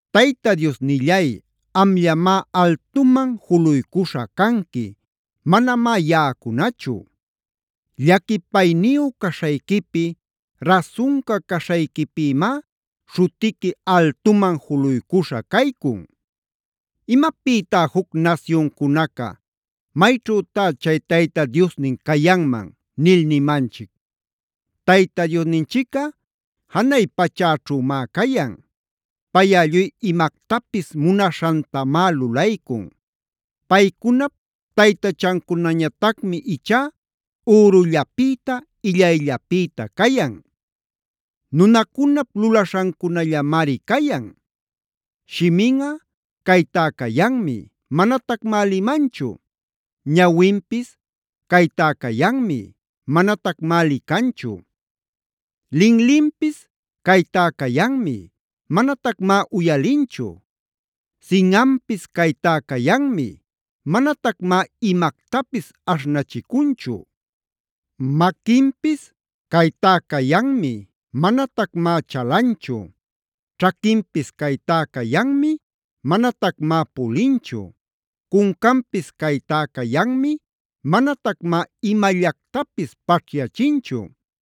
Tayta Diosnillay, amllamá altuman juluycuśha canqui; manamá yaꞌacunachu. Llaquipayniyu caśhayquipi, rasunca caśhayquipïmá śhutiqui altuman juluycuśha caycun. ¿Imapïtá juc nasyuncunaca: “¿Mayćhütá chay Tayta Diosnin cayanman?” nil nimanchic? Tayta Diosninchicꞌa janay pachäćhümá cayan. Payꞌa lluy imactapis munaśhantamá lulaycun. Paycunap taytachancunañatacmi ichá ürullapïta, illayllapïta cayan. Nunacunap lulaśhancunallamari cayan. Shiminꞌa caytá cayanmi, manatacmá limanchu. Ñawinpis caytá cayanmi, manatacmá licanchu. Linlinpis caytá cayanmi, manatacmá uyalinchu. Sinꞌanpis caytá cayanmi, manatacmá imactapis aśhnachicunchu. Maquinpis caytá cayanmi, manatacmá chalanchu. Ćhaquinpis caytá cayanmi manatacmá pulinchu. Cuncanpis caytá cayanmi, manatacmá imallactapis paćhyachinchu.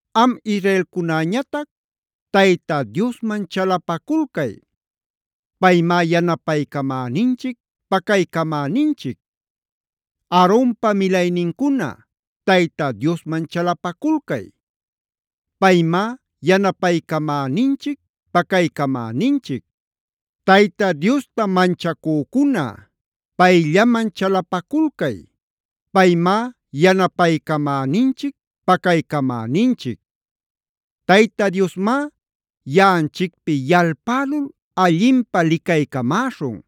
Am israelcunäñatac, Tayta Diosman chalapaculcay. Paymá yanapaycamäninchic, pacaycamäninchic. Aaronpa milaynincuna, Tayta Diosman chalapaculcay. Paymá yanapaycamäninchic, pacaycamäninchic. Tayta Diosta manchacücuna, payllaman chalapaculcay. Paymá yanapaycamäninchic, pacaycamäninchic. Tayta Diosmá yaꞌanchicpi yalpälul allinpä licaycamäśhun.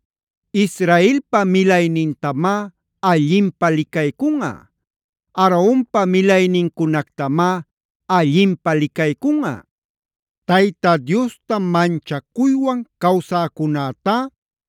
Israelpa milaynintamá allinpä licaycunꞌa. Aaronpa milaynincunactamá allinpä licaycunꞌa. Tayta Diosta manchacuywan cawsäcunätá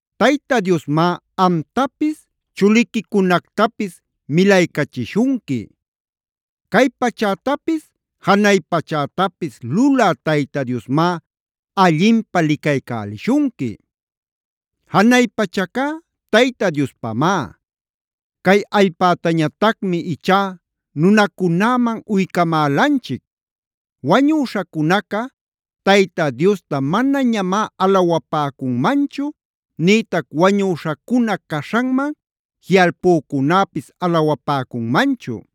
Tayta Diosmá amtapis chuliquicunactapis milaycachishunqui. Cay pachätapis janay pachätapis lulä Tayta Diosmá allinpä licaycälishunqui. Janay pachacá Tayta Diospamá. Cay allpätañatacmi ichá nunacunäman uycamälanchic. Wañüśhacunaca Tayta Diosta manañamá alawapäcunmanchu nïtac wañüśhacuna caśhanman jiꞌalpücunäpis alawapäcunmanchu.